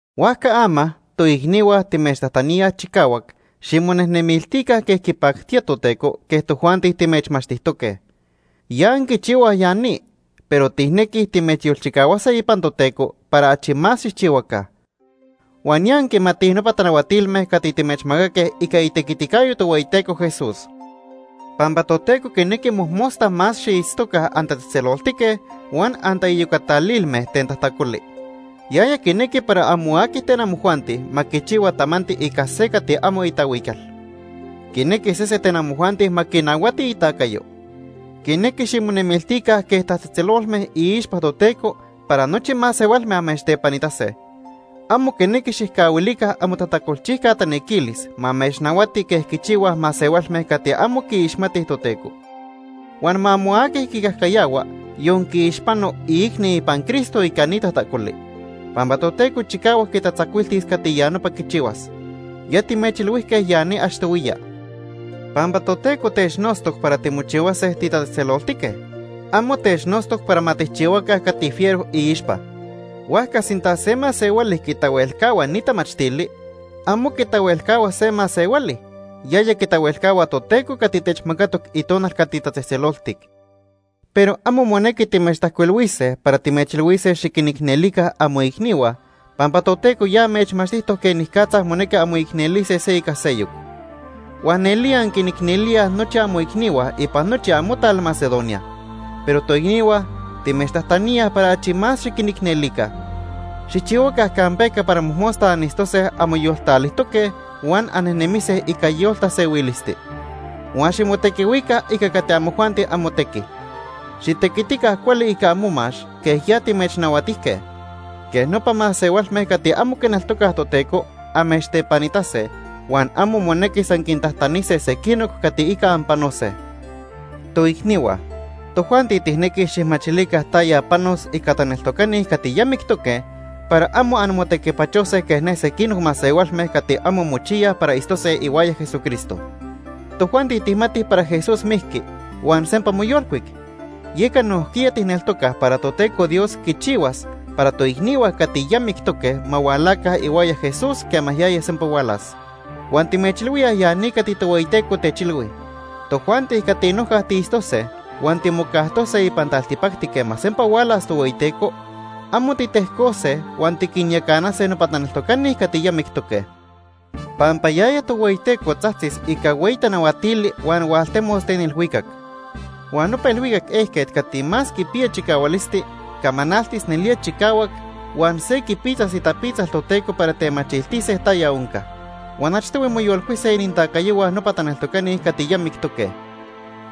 Huajca ama, toicnihua timechtajtaníaj chicahuac ximonejnemiltica quej quipactía Toteco quej tojuanti timechmachtijtoque. Ya anquichihuaj ya ni, pero tijnequij timechyolchicahuase ipan Toteco para achi más xijchihuaca. Huan ya anquimatij nopa tanahuatilme cati timechmacaque ica itequiticayo Tohueyiteco Jesús. Pampa Toteco quinequi mojmosta más xiitztoca antatzejtzeloltique huan antaiyocatalilme ten tajtacoli. Yaya quinequi para amo aqui ten amojuanti ma quichihua tamanti ica se cati amo itahuical. Quinequi sese ten amojuanti ma quinahuati itacayo. Quinequi ximonemiltica quej tatzejtzelolme iixpa Toteco para nochi masehualme amechtepanitase. Amo quinequi xijcahuilica amotajtacolchijca tanequilis ma amechnahuati quej quichihuaj masehualme cati amo quiixmatij Toteco. Huan ma amo aqui quicajcayahua, yon quiixpano, iicni ipan Cristo ica ni tajtacoli, pampa Toteco chicahuac quitatzacuiltis cati ya nopa quichihuas. Ya timechilhuijque ya ni achtohuiya. Pampa Toteco technotztoc para timochihuase titatzejtzeloltique, amo technotztoc para ma tijchihuaca cati fiero iixpa. Huajca sinta se masehuali quitahuelcahua ni tamachtili, amo quitahuelcahua se masehuali; yaya quitahuelcahua Toteco cati techmacatoc Itonal cati tatzejtzeloltic. Pero amo monequi timechtajcuilhuise para timechilhuise xiquinicnelica amoicnihua, pampa Toteco ya amechmachtijtoc quenicatza monequi anmoicnelise se ica seyoc. Huan nelía anquinicnelíaj nochi amoicnihua ipan nochi amotal Macedonia. Pero toicnihua, timechtajtaníaj para achi más xiquinicnelica. Xijchihuaca campeca para mojmosta anitztose anmoyoltalijtoque huan annejnemise ica yoltasehuilisti. Huan ximotequihuica ica cati amojuanti amotequi. Xitequitica cuali ica amomax quej ya timechnahuatijque. Quej nopa masehualme cati amo quineltocaj Toteco amechtepanitase, huan amo monequis anquintajtanise sequinoc cati ica anpanose. Toicnihua, tojuanti tijnequij xijmachilica taya panos ica taneltocani cati ya mictoque para amo anmotequipachose quej ne sequinoc masehualme cati amo mochiyaj para itztose ihuaya Jesucristo. Tojuanti tijmatij para Jesús mijqui huan sempa moyolcuic, yeca nojquiya tijneltocaj para Toteco Dios quichihuas para toicnihua cati ya mictoque ma hualaca ihuaya Jesús quema yaya sempa hualas. Huan timechilhuíaj ya ni cati Tohueyiteco techilhui. Tojuanti cati noja tiitztose huan timocajtose ipan taltipacti quema sempa hualas Tohueyiteco, amo titejcose huan tiquinyacanase nopa taneltocani cati ya mictoque. Pampa yaya Tohueyiteco tzajtzis ica hueyi tanahuatili huan hualtemos ten ilhuicac. Huan nopa ilhuicac ejquet cati más quipiya chicahualisti camanaltis nelía chicahuac huan se quipitzas itapitzal Toteco para temachiltise taya onca. Huan achtohui moyolcuise inintacayohua nopa taneltocani cati ya mictoque.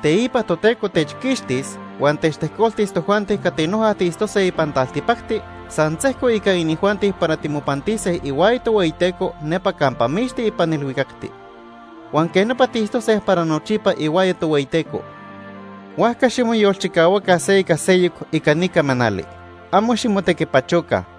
Teipa Toteco techquixtis huan techtejcoltis tojuanti cati noja tiitztose ipan taltipacti san sejco ica inijuanti para timopantise ihuaya Tohueyiteco nepa campa mixti ipan ilhuicacti. Huan quej nopa tiitztose para nochipa ihuaya Tohueyiteco. Huajca ximoyolchicahuaca se ica seyoc ica ni camanali. Amo ximotequipachoca.